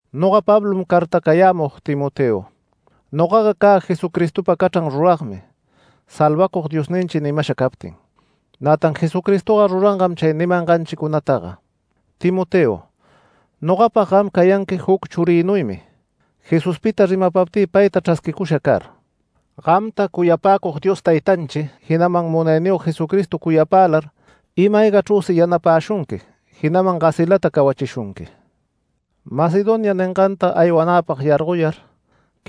Noga Pablom cartacayämug Timoteo. Nogaga cä Jesucristopa cachran ruragmi Salvacug Diosninchi nimasha captin. Nätan Jesucristoga rurangam chay nimanganchicunataga. Timoteo, nogapag gam cayanqui juc churïnuymi Jesuspita rimapaptï payta chrasquicusha car. Gamta cuyapäcug Dios Taytanchi, jinaman Munayniyog Jesucristo cuyapälar ima-aygachrüsi yanapäshunqui jinaman gasilata cawachishunqui. Macedonia ninganta aywanäpag yargoyar,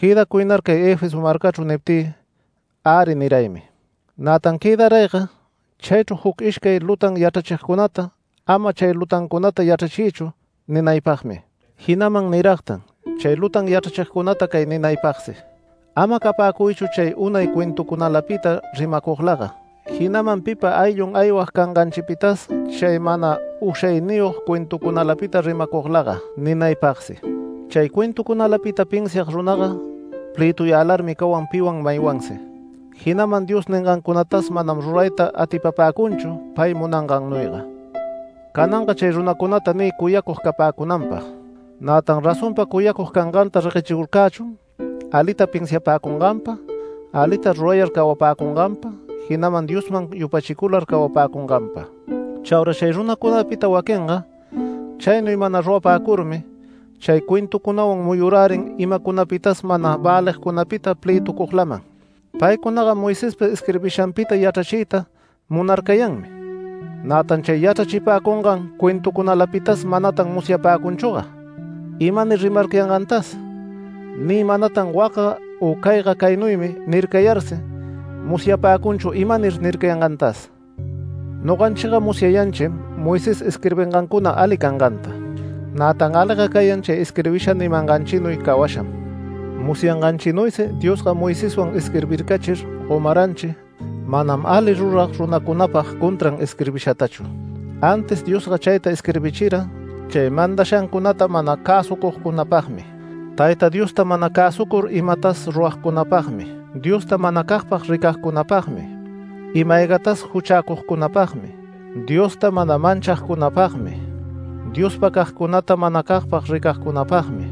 “Quëdacuynar cay Efeso marcachru” niptï, “Äri” niraymi. Nätan quëdarayga chaychru juc ishcay lutan yachrachigcunata “Ama chay lutancunata yachrachiychu” ninaypagmi. Jinaman niragtan chay lutan yachrachigcunata cay ninaypagsi: “Ama capäcuychu chay unay cuentucunalapita rimacuglaga, jinaman pipa ayllun aywag canganchipitas chay mana ushayniyog cuentucunalapita rimacuglaga” ninaypagsi. Chay cuentucunalapita pinsiag runaga plëtuyälarmi cawan piwan maywansi, jinaman Dios ningancunatas manam rurayta atipapäcunchu pay munangannuyga. Cananga chay runacunata niy cuyacug capäcunanpag. Nätan razonpa cuyacug canganta reguechicurcächun alita pinsiapäcunganpa, alita rurayar cawapäcunganpa, jinaman Diosman yupachicular cawapäcunganpa. Chaura chay runacunapita waquinga chaynuy mana rurapäcurmi chay cuentucunawan muyurärin imacunapitas mana välicunapita plëtucuglaman. Paycunaga Moisespa isquirbishanpita yachrachiyta munarcayanmi. Nätan chay yachrachipäcungan cuentucunalapitas manatan musyapäcunchüga imanir rimarcayangantas, ni manatan “Wacga u cayga caynuymi” nircayarsi, musyapäcunchu imanir nircayangantas. Noganchiga musyayanchim Moisés isquirbingancuna ali canganta. Nätan aliga cayan chay isquirbisha nimanganchinuy cawasham. Musyanganchinuysi Diosga Moiseswan isquirbircachir gomaranchi manam ali rurag runacunapag contran isquirbishatachu. Antis Diosga chayta isquirbichira chay mandashancunata mana cäsucugcunapagmi, Tayta Diosta mana cäsucur imatas ruragcunapagmi, Diosta manacagpag ricagcunapagmi, ima-aygatas juchäcugcunapagmi, Diosta mana manchagcunapagmi, Diospagcagcunata manacagpag ricagcunapagmi,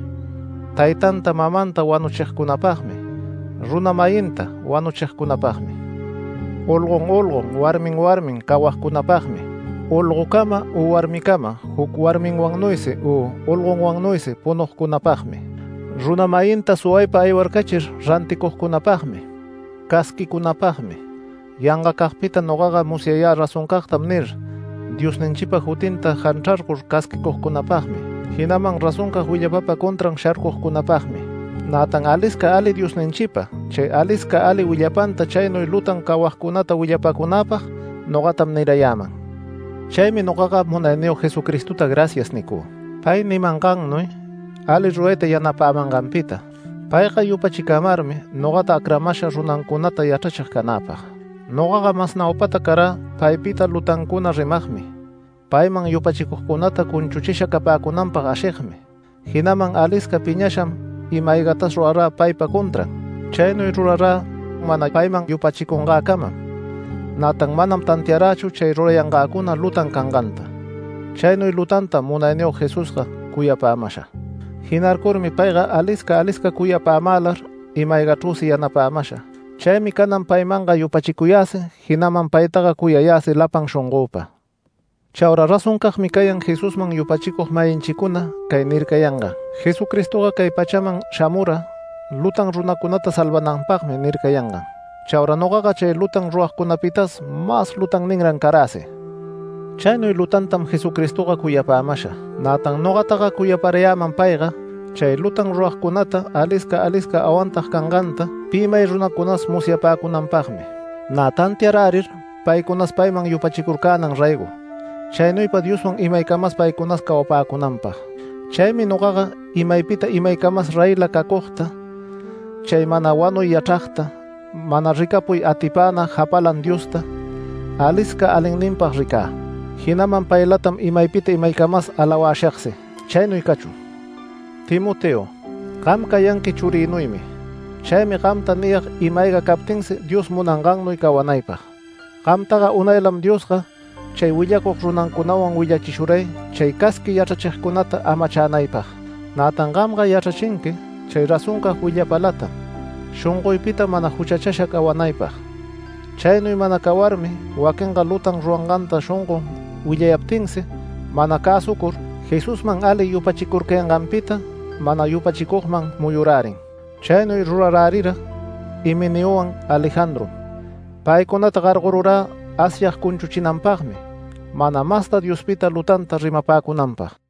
taytanta mamanta wanuchigcunapagmi, runa-mayinta wanuchigcunapagmi, olgon olgon, warmin warmin cawagcunapagmi, olgocama u warmicama juc warminwannuysi u olgonwannuysi punugcunapagmi, runa-mayinta suwaypa aywarcachir ranticugcunapagmi, casquicunapagmi, yangacagpita “Nogaga musyayä razoncagtam” nir, Diosninchipa jutinta janchrarcur casquicugcunapagmi, jinaman razoncag willapapa contran sharcugcunapagmi. Nätan alisca ali Diosninchipa, chay alisca ali willapanta chaynuy lutan cawagcunata willapapäcunäpag nogatam nirayäman. Chaymi nogaga Munayniyog Jesucristota “Gracias” nicü, pay nimangannuy ali rurayta yanapämanganpita. Payga yupachicamarmi nogata acramasha runancunata yachrachig canäpag. Nogaga mas naupata carä paypita lutancuna rimagmi, payman yupachicugcunata cunchuchisha capäcunanpag ashigmi, jinaman alisca piñasham ima-aygatas rurarä paypa contran. Chaynuy rurarä mana payman yupachicungäcamam, nätan manam tantiarächu chay rurayangäcuna lutan canganta. Chaynuy lutantam Munayniyog Jesusga cuyapämasha. Jinarcurmi payga alisca alisca cuyapämälar, ima-aygachrüsi yanapämasha. Chaymi canan paymanga yupachicuyäsi, jinaman paytaga cuyayäsi lapan shongöpa. Chaura razoncagmi cayan Jesusman yupachicug-mayinchicuna cay nircayangan: “Jesucristoga cay pachaman shamura lutan ruragcunata salvananpagmi” nircayangan. Chaura nogaga chay lutan ruragcunapitas mas lutanninran caräsi. Chaynuy lutantam Jesucristoga cuyapämasha. Nätan nogataga cuyaparayäman payga chay lutan ruragcunata alisca alisca awantag canganta pi may runacunas musyapäcunanpagmi. Nä tantiarärir paycunas payman yupachicurcänan raygo, chaynuypa Dioswan imaycamas paycunas cawapäcunanpag. Chaymi nogaga imaypita imaycamas reyla cacugta, chay mana wanuy yachragta, mana ricapuy atipäna Japalan Diosta, alisca alinninpag ricä, jinaman paylatam imaypita imaycamas alawashagsi. Chaynuy cachun. Timoteo, gam cayanqui churïnuymi. Chaymi gamta niyag ima-ayga captinsi Dios munangannuy cawanaypag. Gamtaga unaylam Diosga chay willacug runancunawan willachishuray chay casqui yachrachigcunata amachänaypag. Nätan gamga yachrachinqui chay razoncag willapalatam, shongoypita mana juchachasha cawanaypag. Chaynuy mana cawarmi waquinga lutan rurayanganta shongon willayaptinsi mana cäsucur, Jesusman ali yupachicurcayanganpita mana yupachicugman muyurärin. Chaynuy rurarärira Himeneowan Alejandrom. Paycunata gargorurä Asyag cunchuchinanpagmi mana masta Diospita lutanta rimapäcunanpag.